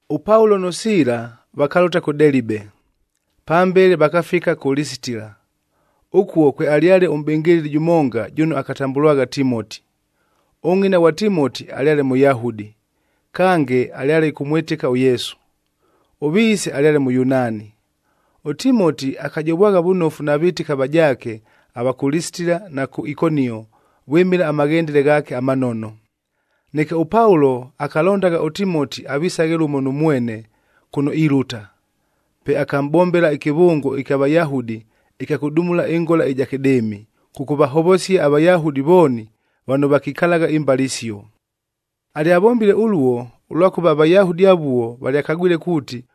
ɄPaulo nʉ Siila vakalʉta kʉ Delibe, pambele vakafika kʉ Lisitila. Ʉkuo kwealyale ʉmʼbɨngɨlɨli jʉmonga jʉno akatambʉlwagha Timoti. Ʉngʼina ghwa Timoti alyale Mʉyahudi, kange alyale ɨkʉmwɨtɨka ʉYesu, ʉviise alyale Mʉyunaani. ɄTimoti akajovwagha vʉnofu na vɨtɨki avajaake ava kʉ Lisitila na kʉ Ikonio vwɨmɨla amaghendele ghaake amanono. Neke ʉPaulo akalondagha ʉTimoti avisaghe lʉmo nʉ mwene kʉno ilʉta, pe akamʼbombela ɨkɨvʉngo ɨkya Vayahudi ɨkya kʉdumulua ɨngola ɨja kɨdɨɨmi, kʉkʉvahovosia aVayahudi vooni vano vakikalagha imbale isio. Alyavombile ʉluo, ʉlwakʉva aVayahudi avuo valyakagwile kuuti,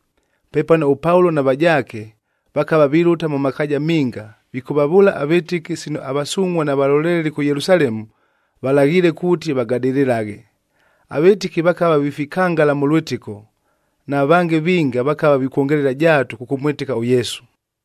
Pepano ʉPaulo na vajaake, vakava vilʉta mʉ makaaja minga vikʉvavʉʉla avɨtɨki sino avasungʼhua na valoleleli kʉ Yelusalemu, valaghiile kuuti vagadɨlɨlaghe. Avɨtɨki vakava vifikangala mʉ lwɨtɨko, na vange vinga vakava vikwongelela jaatu kʉkʉmwɨtɨka ʉYesu.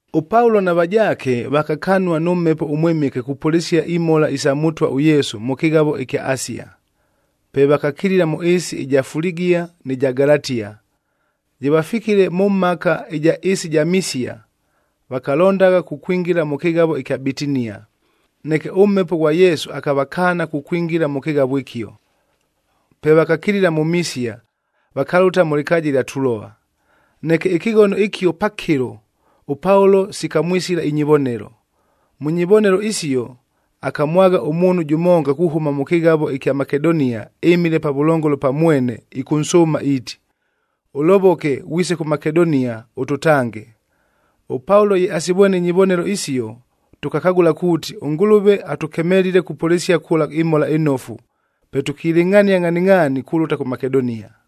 ɄPaulo na vajaake vakakanua nʉ Mhepo ʉMwɨmɨke kupʉlɨsia imhola isa Mʉtwa ʉYesu mʉ kɨghavo ɨkya Asia. Pe vakakilila mʉ ɨɨsi ɨja Fuligia nɨ ja Galatia. Ye vafikile mʉ mhaka ɨja ɨɨsi ɨja Misia, vakalondagha kukwingila mʉ kɨghavo ɨkya Bitinia, neke ʉMhepo ghwa Yesu akavakaana kukwingila mʉ kɨghavo ɨkio. Pe vakakilila mʉ Misia, vakalʉta mʉ lɨkaaja ɨlya Tuloa. Neke ɨkɨghono ɨkio pakɨlo, ʉPaulo sikamwisila inyivonelo. Mʉ nyivonelo isio, akamwagha ʉmuunhu jʉmonga kuhʉma mʉ kɨghavo ɨkya Makedonia ɨmile pavʉlongolo pa mwene ɨkʉnsʉʉma iiti, “Ʉlovoke, ghwise kʉ Makedonia ʉtʉtange.” ɄPaulo ye asivwene inyivonelo isio, tʉkakagʉla kuuti, ʉNgʉlʉve atʉkemelile kupʉlɨsia kʉla ɨMhola ɨNofu. Pe tʉkilɨngʼhania ngʼhaningʼhaani kulʉta kʉ Makedonia.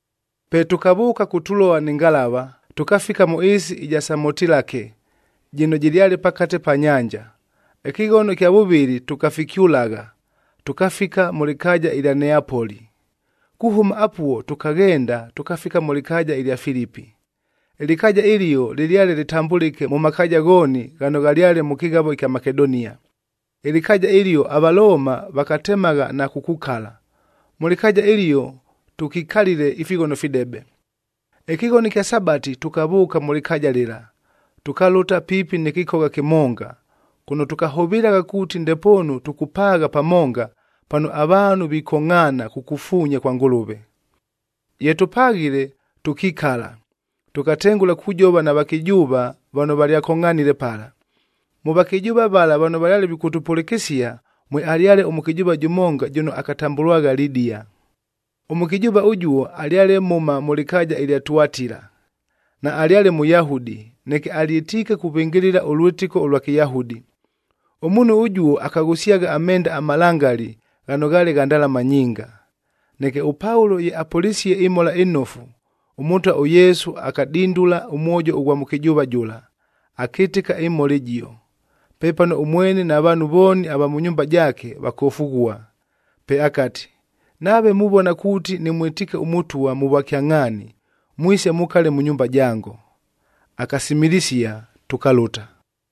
Pe tʉkavʉʉka kʉ Tuloa nɨ ngalava, tʉkafika mʉ ɨɨsi ɨja Samotilake jɨno jɨlyale pakate pa nyanja. Ɨkɨghono ɨkya vʉvɨlɨ tʉkafikyʉlagha, tʉkafika mʉ lɨkaaja ɨlya Neapoli. Kuhʉma apuo tʉkaghenda tʉkafika mʉ lɨkaaja ɨlya Filipi. Ɨlɨkaaja ɨlio lɨlyale lɨtambʉlɨke mʉ makaaja ghooni ghano ghalyale mʉ kɨghavo ɨkya Makedonia. Ɨlɨkaaja ɨlio aValooma vakatemagha na kukukala. Mʉ lɨkaaja ɨlio tʉkikalile ifighono fidebe. Ɨkɨghono ɨkya Sabati tʉkavʉʉka mʉ lɨkaaja lɨla, tʉkalʉta piipi nɨ kɨkogha kɨmonga, kʉno tʉkahʉvɨlagha kuuti ndepoonu tʉkʉpaagha pamonga, pano avaanhu vikongʼhaana kukufuunya kwa Ngʉlʉve. Ye tʉpaghile, tʉkikala, tʉkatengʉla kujova na vakɨjʉʉva vano valyakongʼhanile pala. Mʉ vakɨjʉʉva vala vano valyale vikʉtʉpʉlɨkɨsia, mwealyale ʉmʉkɨjʉʉva jʉmonga jʉno akatambʉlwagha Lidia. Ʉmʉkɨjʉʉva ʉjuo alyale mhʉma mʉ lɨkaaja ɨlya Tuatila, naalyale Mʉyahudi neke alyɨtiike kuvɨngɨlɨla ʉlwɨtɨko ʉlwa Kɨyahudi. Ʉmuunhu ʉjuo akaghʉsyagha amenda amalangali ghano ghaale gha ndalama nyinga. Neke ʉPaulo ye apʉlisie ɨMhola ɨNofu, ʉMʉtwa ʉYesu akadindula ʉmwojo ʉghwa mʉkɨjʉʉva jʉla, akɨtɨka ɨmhola ɨjio. Pepano ʉmwene na vaanhu vooni ava mʉ nyumba jaake vakofughua. Pe akati, “Nave muvona kuuti nɨmwɨtiike ʉMʉtwa mʉ vwakyangʼhaani, mwise mukale mʉ nyumba jango.” Akasimilisia, tʉkalʉta.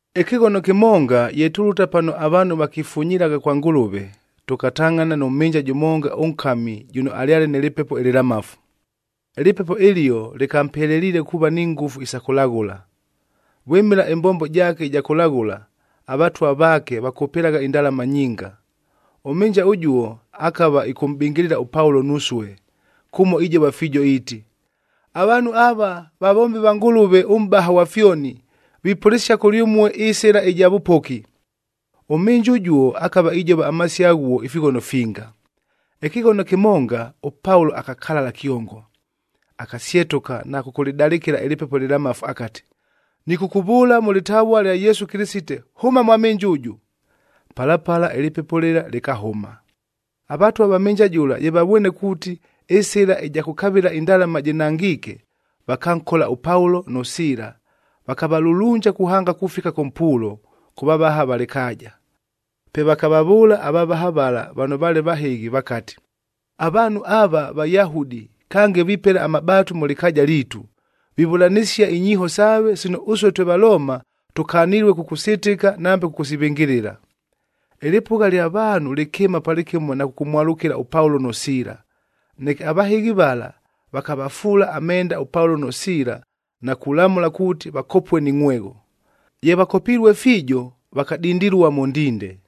Ɨkɨghono kɨmonga ye tulʉta pano avaanhu vakifunyilagha kwa Ngʉlʉve, tʉkatangʼhana nʉ mhɨnja jʉmonga ʉnkami jʉno alyale nɨ lɨpepo ɨlɨlamafu. Ɨlɨpepo ɨlio lɨkampeleliile kuuva ni ngʉfu isa kʉlaghʉla. Vwɨmɨla ɨmbombo jaake ɨja kʉlaghʉla, avatwa vaake vakʉpɨlagha indalama nyinga. Ʉmhɨnja ʉjuo akava ɨkʉmʼbɨngɨlɨla ʉPaulo nusue, kʉmo ijova fiijo iiti, “Avaanhu ava, vavombi va Ngʉlʉve ʉMʼbaha ghwa fyoni. Vipʉlɨsia kʉlyʉmue ɨsɨla ɨja vʉpoki.” Ʉmhɨnja ʉjuo akava ijova amasio aghuo ifighono finga. Ɨkɨghono kɨmonga, ʉPaulo akakalala kyongo, akasyetʉka na kʉkʉlɨdalɨkɨla ɨlɨpepo ɨlɨlamafu akati, “Nɨkʉkʉvʉʉla mʉ lɨtavua lya Yesu Kɨlɨsite, hʉma mwa mhɨnja ʉjʉ!” Pala pala ɨlɨpepo lɨla lɨkahʉma. Avatwa va mhɨnja jʉla ye vavwene kuuti, ɨsɨla ɨja kʉkavɨla indalama jɨnangiike, vakankola ʉPaulo nʉ Siila vakavalulunja kuhanga kufika kʉ mpuulo, kʉ vavaha va lɨkaaja. Pe vakavavʉʉla avavaha vala vano vaale vahɨghi vakati, “Avaanhu ava Vayahudi, kange vipela amabaatu mʉ lɨkaaja liitu. Vivʉlanɨsia inyiiho saave sino ʉsue twe Valooma tʉkanilue kʉkʉsɨtɨka nambe kʉkʉsivɨngɨlɨla.” Ɨlɨpʉgha lya vaanhu lɨkɨɨma palɨkɨmo na kʉkʉmwalʉkɨla ʉPaulo nʉ Siila, neke avahɨghi vala, vakavafuula amenda ʉPaulo nʉ Siila na kulamʉla kuuti, vakopue ni ngʼhwegho. Ye vakopilue fiijo, vakadindilua mʉ ndinde.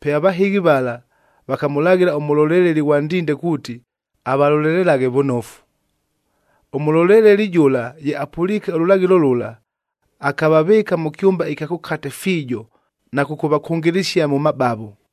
Pe avahɨghi vala vakamʉlaghɨla ʉmʉloleleli ghwa ndinde kuuti avalolelelaghe vʉnofu. Ʉmʉloleleli jʉla ye apʉliike ʉlʉlaghɨlo lʉla, akavavɨɨka mʉ kyʉmba ɨkya kʉkate fiijo na kʉkʉvakʉngɨlɨsia mʉ mabavo.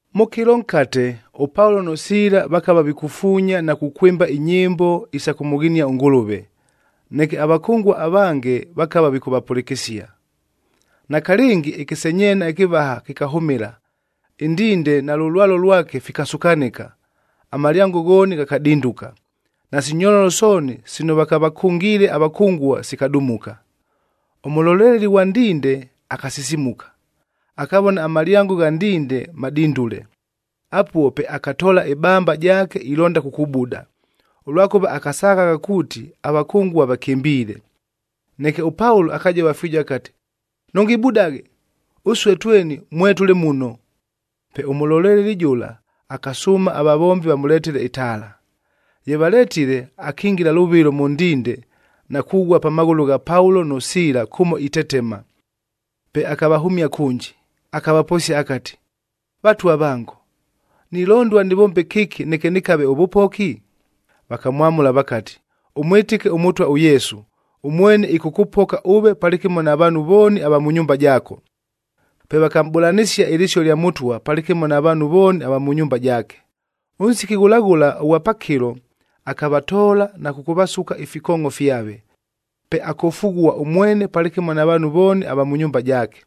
Mʉ kɨlo nkate, ʉPaulo nʉ Siila vakava vikufuunya na kukwɨmba inyɨmbo isa kʉmʉghinia ʉNgʉlʉve, neke avakʉngua avange vakava vikʉvapʉlɨkɨsia. Nakalɨngi ɨkɨsenyeena ɨkɨvaha kɨkahʉmɨla, ɨndinde nalʉ lwalo lwake fikasukanɨka, amalyango ghooni ghakadinduka, nasi nyololo sooni sino vakavakʉngiile avakʉngua sikadumuka. Ʉmʉloleleli ghwa ndinde akasisimuka, akavona amalyango gha ndinde madindule. Apuo pe akatoola ɨbamba jaake ilonda kukubuda, ʉlwakʉva akasaghagha kuuti avakʉngua vakɨmbiile. Neke ʉPaulo akajova fiijo akati, “Nʉngibudaghe! Ʉsue tweni mwetʉle muno!” Pe ʉmʉloleleli jʉla akasʉʉma avavombi vamʉletele itaala. Ye valetile, akingila lʉvɨlo mʉ ndinde na kughua pa maghʉlʉ gha Paulo nʉ Siila kʉmo itetema. Pe akavahʉmia kʉnji, akavaposia akati, “Vatwa vango, nilondua nɨvombe kɨki neke nɨkave ʉvʉpoki?” Vakamwamʉla vakati, “Ʉmwɨtɨke ʉMʉtwa ʉYesu, ʉmwene ɨkʉkʉpoka ʉve palɨkɨmo na vaanhu vooni ava mʉ nyumba jaako.” Pe vakamʼbʉlanɨsia ɨlɨsio lya Mʉtwa palɨkɨmo na vaanhu vooni ava mʉ nyumba jaake. Ʉnsiki ghʉla ghʉla ʉghwa pakɨlo, akavatoola na kʉkʉvasuka ifikoongʼo fyave. Pe akofughua ʉmwene palɨkɨmo na vaanhu vooni ava mʉ nyumba jaake.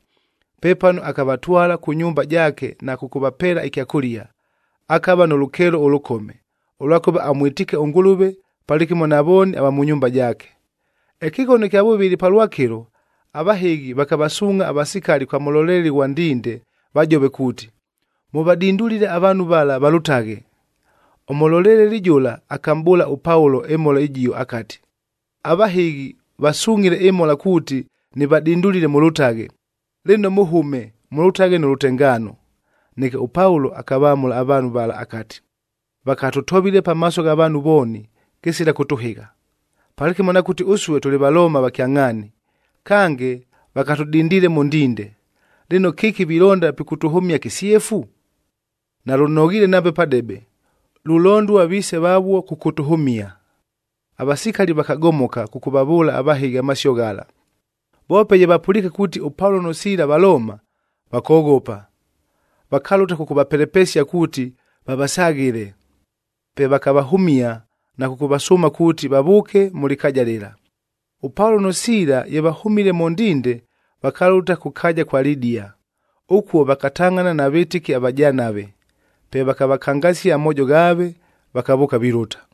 Pepano akavatwala kʉ nyumba jaake na kʉkʉvapeela ɨkyakʉlia, akava nʉ lʉkeelo ʉlʉkome, ʉlwakʉva amwɨtiike ʉNgʉlʉve palɨkɨmo na vooni ava mʉ nyumba jaake. Ɨkɨghono ɨkya vʉvɨlɨ palwakɨlo, avahɨghi vakavasuungʼha avasikali kwa mʉloleleli ghwa ndinde vajove kuuti, “Mʉvadindulile avaanhu vala valʉtaghe.” Ʉmʉloleleli jʉla akamʼbʉʉla ʉPaulo ɨmhola ɨjio akati, “Avahɨghi vasungʼhile ɨmhola kuuti nɨvadindulile mʉlʉtaghe. Lɨno mʉhʉme, mʉlʉtaghe nʉ lʉtengaano.” Neke ʉPaulo akavamʉla avaanhu vala akati, “Vakatʉtovile pamaaso gha vaanhu vooni kɨsila kʉtʉhɨgha, palɨkɨmo na kuuti ʉsue tʉlɨ Valoomab va kyangʼhaani, kange vakatʉdindiile mʉ ndinde, lɨno kɨki vilonda pikʉtʉhʉmia kɨsyefu? Nalʉnoghiile nambe padebe! Lulondua viise vavuo kʉkʉtʉhʉmia.” Avasikali vakagomoka kʉkʉvavʉʉla avahɨghi amasio ghala, voope ye vapʉliike kuuti ʉPaulo nʉ Siila Valooma, vakoghopa, vakalʉta kʉkʉvapelepesia kuuti vavasaghɨle. Pe vakavahʉmia na kʉkʉvasʉʉma kuuti vavʉʉke mʉ lɨkaaja lɨla. ɄPaulo nʉ Siila ye vahʉmile mʉ ndinde, vakalʉta kʉ kaaja ja Lidia. Ʉkuo vakatangʼhana na vɨtɨki avajanave, pe vakavakangasia amoojo ghaave, vakavʉʉka vilʉta.